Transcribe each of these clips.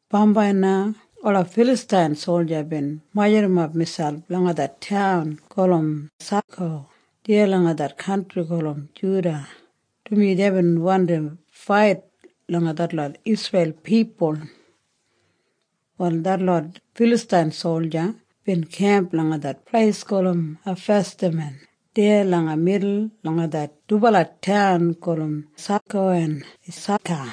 Bambai na ola Filastain solja bin majurrumap miselp langa det taun gulum Sako deya langa det kantri gulum Juda, dumaji deibin wandi fait langa detlot Isreil pipul. Wal detlot Filastain solja bin kemp langa det pleis gulum Ifesdamim deya langa midul langa det dubala taun gulum Sako en Esaka.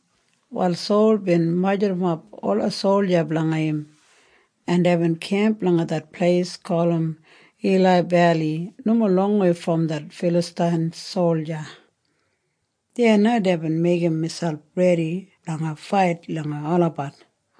Wal Sol bin majurrumap ola solja blanga im, en deibin kemp langa det pleis gulum Ila Beli nomo longwei brom detlot Filastain solja. Deya na deibin meigim miselp redi blanga fait langa olabat.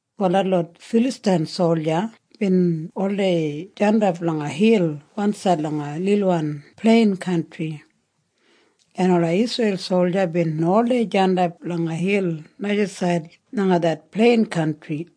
Wal detlot Filastain solja bin oldei jandap langa hil wansaid langa lilwan plein kantri, en ola Isreil solja bin oldei jandap langa hil najasaid langa det plein kantri.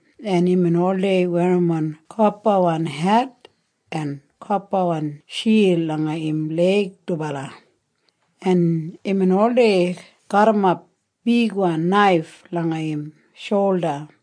en imbin oldei werrimon kopawan het en kopawan shild langa im leig dubala, en imbin oldei garrimap bigwan naif langa im sholda.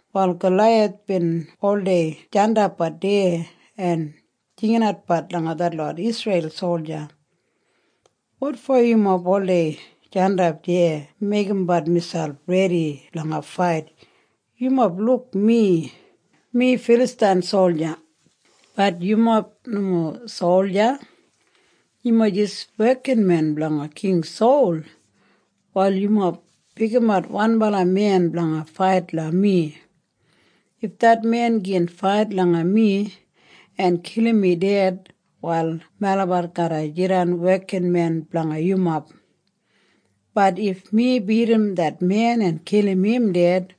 Wal Galaiyath bin oldei jandapbat deya en jinginatbat langa detlot Isreil solja, “Wotfo yumob oldei jandap deya meigimbat miselp redi blanga fait? Yumob luk mi? Mi Filastain solja. Bat yumob nomo solja. Yumob jis wekinmen blanga King Sol. Wal yumob pikimat wanbala men blanga fait langa mi. If det men gin fait langa mi en kilim mi ded, wal melabat garra jidan wekinmen blanga yumob. Bat if mi bidim det men en kilim im ded,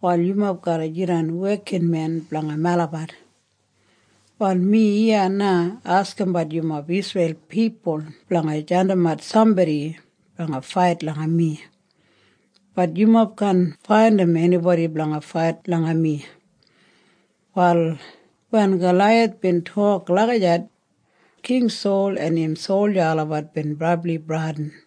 wal yumob garra jidan wekinmen blanga melabat. Wal mi iya na askimbat yumob Isreil pipul blanga jandimat sambodi blanga fait langa mi. Bat yumob kaan faindim enibodi blanga fait langa mi.” Wal wen Galaiyath bin tok lagijat, King Sol en im solja olabat bin brabli bradin.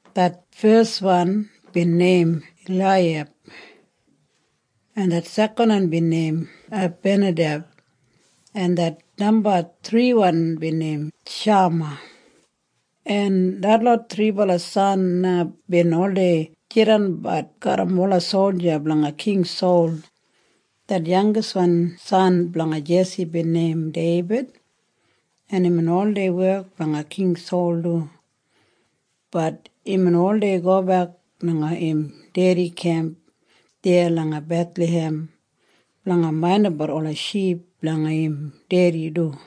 Det feswan bin neim Eliyab, en det sekanwan bin neim Abinadeb, en det namba thriwan bin neim Shama, en detlot thribala san na bin oldei jidanbat garram ola solja blanga King Sol. Det yangiswan san blanga Jesi bin neim Deibid, en imbin oldei wek blanga King Sol du. Bat imbin oldei gobek langa im dedi kemp deya langa Bethlahem blanga maindimbat ola ship blanga im dedi du.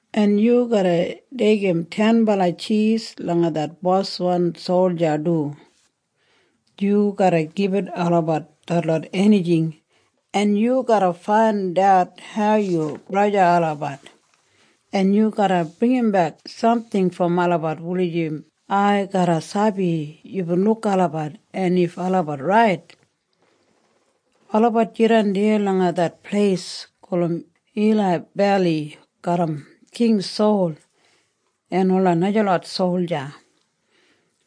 en yu garra deigim tenbala tjis langa det boswan solja du. Yu garra gibit olabat detlot enijing, en yu garra faindat hau yu braja olabat, en yu garra bringimbek samting brom olabat wulijim ai garra sabi yubin luk olabat en if olabat rait. Olabat jidan deya langa det pleis gulum Ila Beli garram King Sol en ola najalot solja.”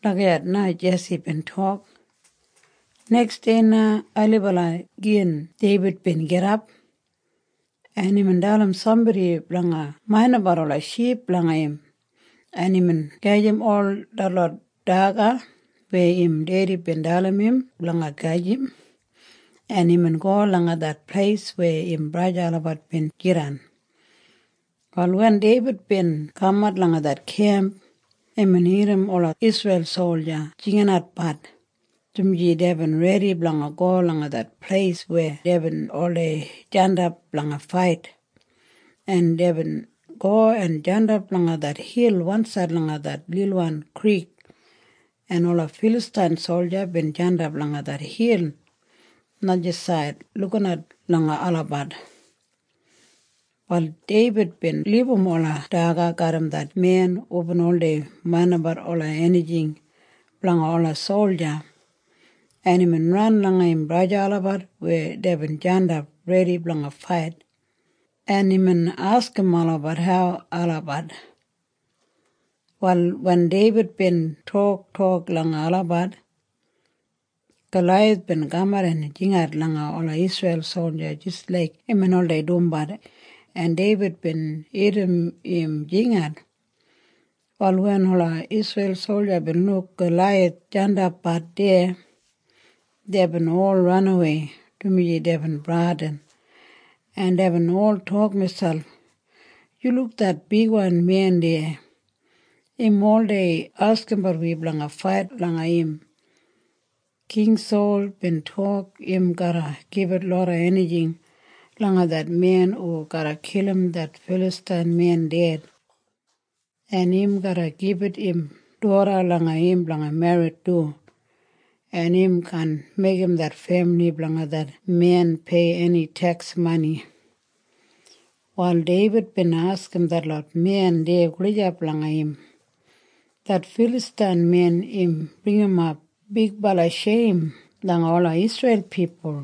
Lagijat na Jesi bin tok. Neksdei na ailibala gin Deibid bin gidap, en imbin dalim sambodi blanga maindimbat ola ship blanga im, en imbin gajim ol detlot daga weya im dedi bin dalim im blanga gajim, en imbin go langa det pleis weya im braja olabat bin jidan. Wal wen Deibid bin kamat langa det kemp, imbin irrim ola Isreil solja jinginatbat, dumaji deibin redi blanga go langa det pleis weya deibin oldei jandap blanga fait, en deibin go en jandap langa det hil wansaid langa det lilwan krik, en ola Filastain solja bin jandap langa det hil najasaid lukinat langa olabat. Wal Deibid bin libum ola daga garram det men hubin oldei maindimbat ola enijing blanga ola solja, en imbin ran langa im braja olabat weya deibin jandap redi blanga fait, en imbin askim olabat hau olabat. Wal wen Deibid bin toktok langa olabat, Galaiyath bin kamat en jingat langa ola Isreil solja jis laik imbin oldei dumbat, en Deibid bin irrim im jingat. Wal wen ola Isreil solja bin luk Galaiyath jandapbat deya, deibin ol ranawei, dumaji deibin bradin, en deibin ol tok miselp, “Yu luk det bigwan men deya? Im oldei askimbat wi blanga fait langa im. King Sol bin tok im garra gibit loda enijing langa det men hu garra kilim det Filastain men ded, en im garra gibit im doda langa im blanga merrit du, en im kaan meigim det femili blanga det men pei eni teks mani.” Wal Deibid bin askim detlot men deya gulijap langa im, “Det Filastain men im bringimap bigbala sheim langa ola Isreil pipul.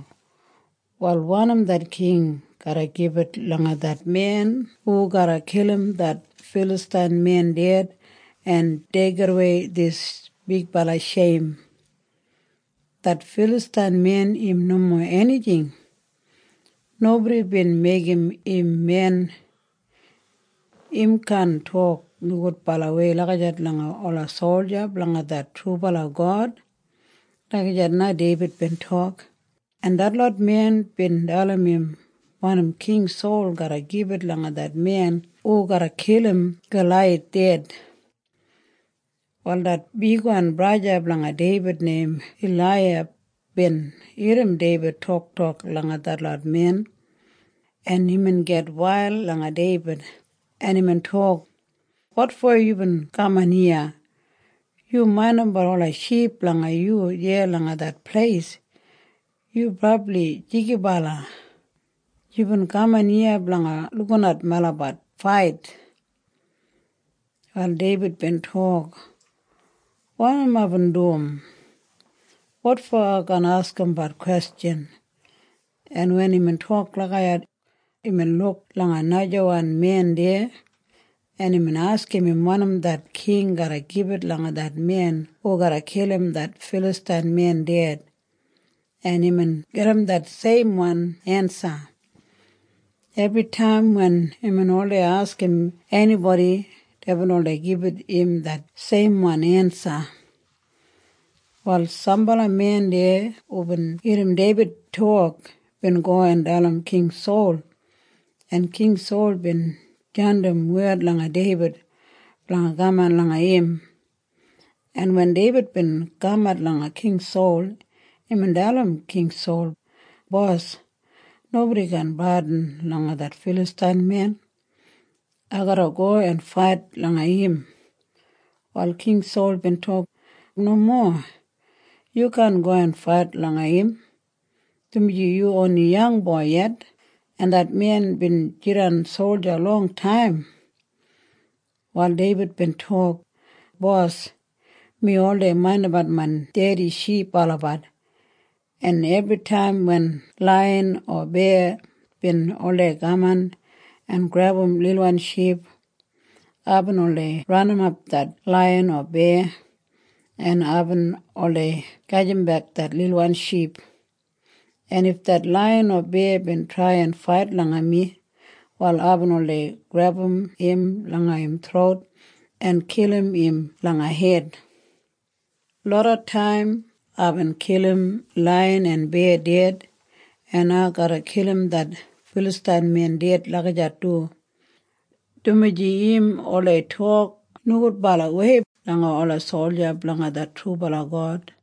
Wal wanim det king garra gibit langa det men hu garra kilim det Filastain men ded en deigidawei dis bigbala sheim? Det Filastain men im nomo enijing. Nobodi bin meigim im men. Im kaan tok nogudbalawei lagijat langa ola solja blanga det trubala God.” Lagijat na Deibid bin tok, en detlot men bin dalim im wanim King Sol garra gibit langa det men hu garra kilim Galaiyath ded. Wal det bigwan braja blanga Deibid neim Eliyab bin irrim Deibid toktok langa detlot men, en imbin gitwail langa Deibid, en imbin tok, “Wotfo yubin kaman iya? Hu maindimbat ola ship blanga yu deya langa det pleis? Yu brabli jigibala! Yubin kaman iya blanga lukinat melabat fait.” Wal Deibid bin tok, “Wanim aibin dum? Wotfo ai kaan askimbat kwestjan?” En wen imbin tok lagijat, imbin luk langa najawan men deya, en imbin askim im wanim det king garra gibit langa det men hu garra kilim det Filastain men ded, en imbin gedim det seimwan ensa. Ebritaim wen imbin oldei askim enibodi, deibin oldei gibit im det seimwan ensa. Wal sambala men deya hubin irrim Deibid tok, bin go en dalim King Sol, en King Sol bin jandim wed langa Deibid blanga kaman langa im. En wen Deibid bin kamat langa King Sol, imbin dalim King Sol, “Bos, nobodi kaan bradin langa det Filastain men. Ai garra go en fait langa im.” Wal King Sol bin tok, “Nomo. Yu kaan go en fait langa im, dumaji yu oni yangboi yet, en det men bin jidan solja longtaim.” Wal Deibid bin tok, “Bos, mi oldei maindimbat main dedi ship olabat, en ebritaim wen laiyan o beya bin oldei kaman en grebum lilwan ship, aibin oldei ranimap det laiyan o beya, en aibin oldei gajimbek det lilwan ship. En if det laiyan o beya bin trai en fait langa mi, wal aibin oldei grebum im langa im throut en kilim im langa hed. Loda taim aibin kilim laiyan en beya ded, en ai garra kilim det Filastain men ded lagijat du, dumaji im oldei tok nogudbalawei langa ola solja blanga det trubala God.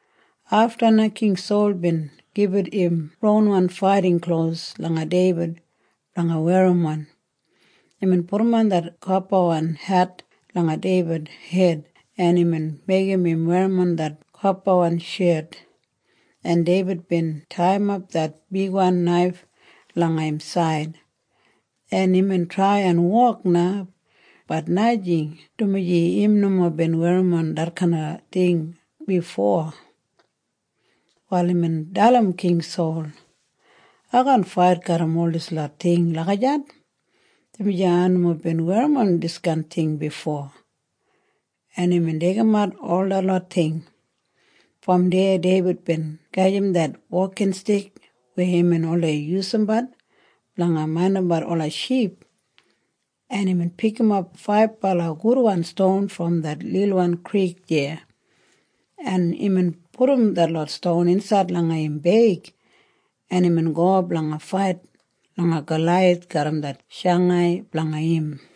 Afta na King Sol bin gibit im ronwan faiting klos langa Deibid blanga werrimon. Imbin pudum det kopawan het langa Deibid hed, en imbin meigim im werrimon det kopawan shet, en Deibid bin taiyimap det bigwan naif langa im said, en imbin trai en wok na. Bat najing, dumaji im nomo bin werrimon detkain ting bifo. Wal imbin dalim King Sol, “Ai kaan fait garram ol dislot ting lagijat, dumaji ai nomo bin werrimon diskain ting bifo.” En imbin deigimat ol detlot ting. Brom deya Deibid bin gajim det wokinstik weya imbin oldei yusumbat blanga maindimbat ola ship, en imbin pikimap faibala gudwan ston brom det lilwan krik deya, en imbin pudum detlot ston insaid langa im beig, en imbin go blanga fait langa Galaiyath garram det shangai blanga im.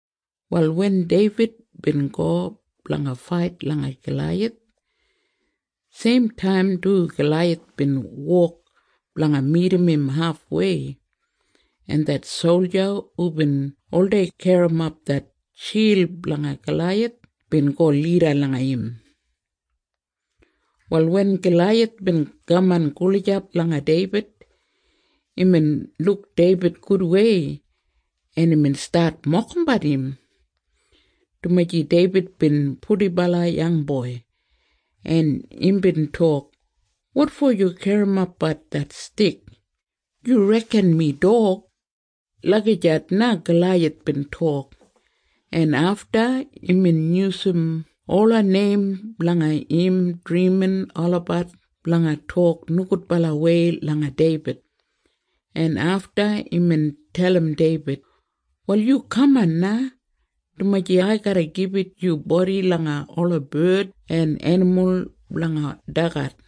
Wal wen Deibid bin go blanga fait langa Galaiyath, seimtaim du Galaiyath bin wok blanga midim im hafwei, en det solja hubin oldei garrimap det shild blanga Galaiyath bin go lida langa im. Wal wen Galaiyath bin kaman gulijap langa Deibid, imbin luk Deibid gudwei, en imbin stat mokimbat im, dumaji Deibid bin purdibala yangboi, en imbin tok, “Wotfo yu garrimapbat det stik? Yu reken mi dog?” Lagijat na Galaiyath bin tok, en afta imbin yusum ola neim blanga im drimin olabat blanga tok nogudbalawei langa Deibid, en afta imbin dalim Deibid, “Wal yu kaman na, dumaji ai garra gibit yu bodi langa ola bard en enimul blanga dagat.”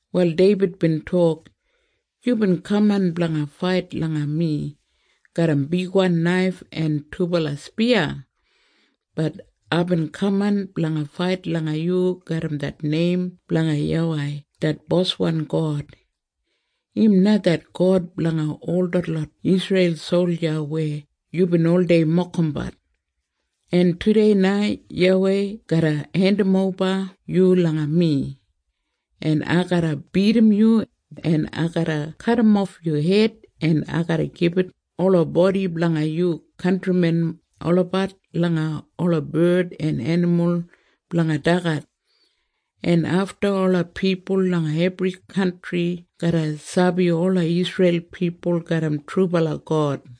Wal Deibid bin tok, “Yubin kaman blanga fait langa mi garram bigwan naif en dubala spiya. Bat aibin kaman blanga fait langa yu garram det neim blanga YAWEI det Boswan God. Im na det God blanga ol detlot Isreil solja weya yubin oldei mokimbat, en tudei na YAWEI garra hendimoba yu langa mi, en ai garra bidim yu, en ai garra kadimof yu hed, en ai garra gibit ola bodi blanga yu kantrimen olabat langa ola bard en enimul blanga dagat, en afta ola pipul langa ebri kantri garra sabi ola Isreil pipul garram trubala God,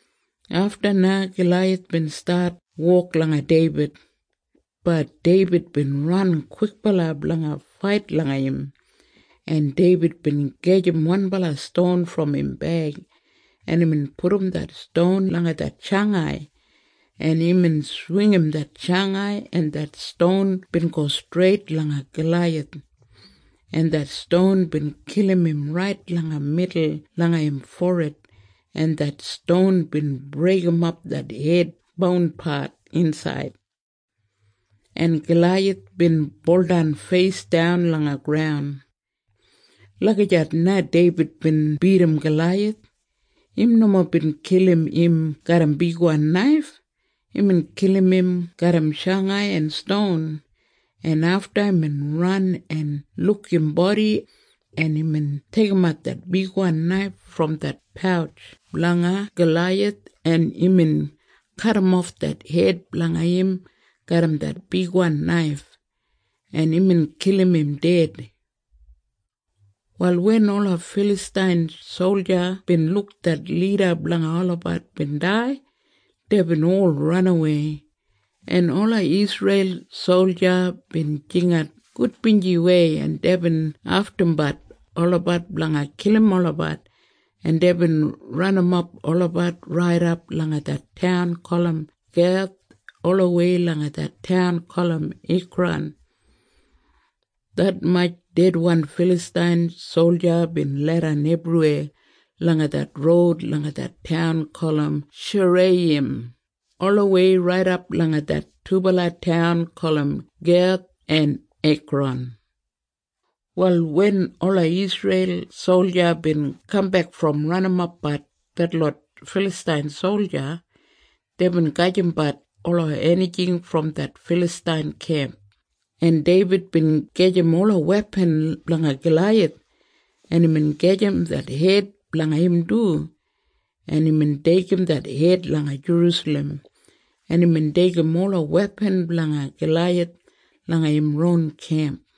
Afta na Galaiyath bin stat wok langa Deibid. Bat Deibid bin ran kwikbala blanga fait langa im, en Deibid bin gajim wanbala ston brom im beig, en imbin pudum det ston langa det shangai, en imbin swingim det shangai, en det ston bin go streit langa Galaiyath, en det ston bin kilim im rait langa midul langa im forid, en det ston bin breigimap det hed bounpat insaid, en Galaiyath bin buldan feisdan langa graun. Lagijat na Deibid bin bidim Galaiyath. Im nomo bin kilim im garram bigwan naif. Imbin kilim im garram shangai en ston, en afta imbin ran en luk im bodi, en imbin deigimat det bigwan naif brom det pautj blanga Galaiyath, en imbin kadimof det hed blanga im garram det bigwan naif, en imbin kilim im ded. Wal wen ola Filastain solja bin luk det lida blanga olabat bin dai, deibin ol ranawei, en ola Isreil solja bin jingat gudbinjiwei, en deibin aftumbat olabat blanga kilim olabat, en deibin ranimap olabat raidap langa det taun gulum Geth olawei langa det taun gulum Ekran. Detmatj dedwan Filastain solja bin leidan ebriweya langa det roud langa det taun gulum Sharaiyim olawei raidap langa det dubala taun gulum Geth en Ekran. Wal wen ola Isreil solja bin kambek brom ranimapbat detlot Filastain solja, deibin gajimbat ola enijing brom det Filastain kemp, en Deibid bin gajim ola wepan blanga Galaiyath, en imbin gajim det hed blanga im du, en imbin deigim det hed langa Jerusalem, en imbin deigim ola wepan blanga Galaiyath langa im ron kemp.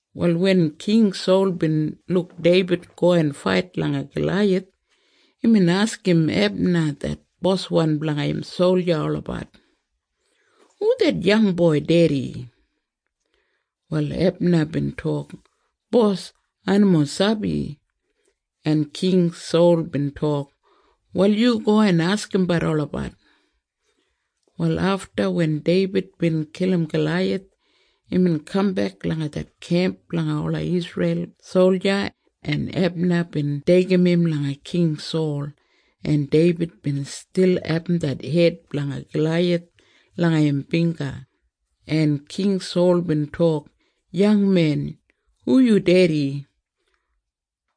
Wal wen King Sol bin luk Deibid go en fait langa Galaiyath, imbin askim Ebna det boswan blanga im solja olabat, “Hu det yangboi dedi?” Wal Ebna bin tok, “Bos, ai nomo sabi.” En King Sol bin tok, “Wal yu go en askimbat olabat.” Wal afta wen Deibid bin kilim Galaiyath, imbin kambek langa det kemp blanga ola Isreil solja, en Ebna bin deigim im langa King Sol, en Deibid bin stil abum det hed blanga Galaiyath langa im bingga, en King Sol bin tok, “Yangmen, hu yu dedi?”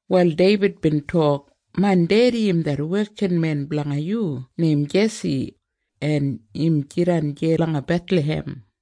Wal Deibid bin tok, “Main dedi im det wekinmen blanga yu neim Jesi, en im jidan deya langa Bethlahem.”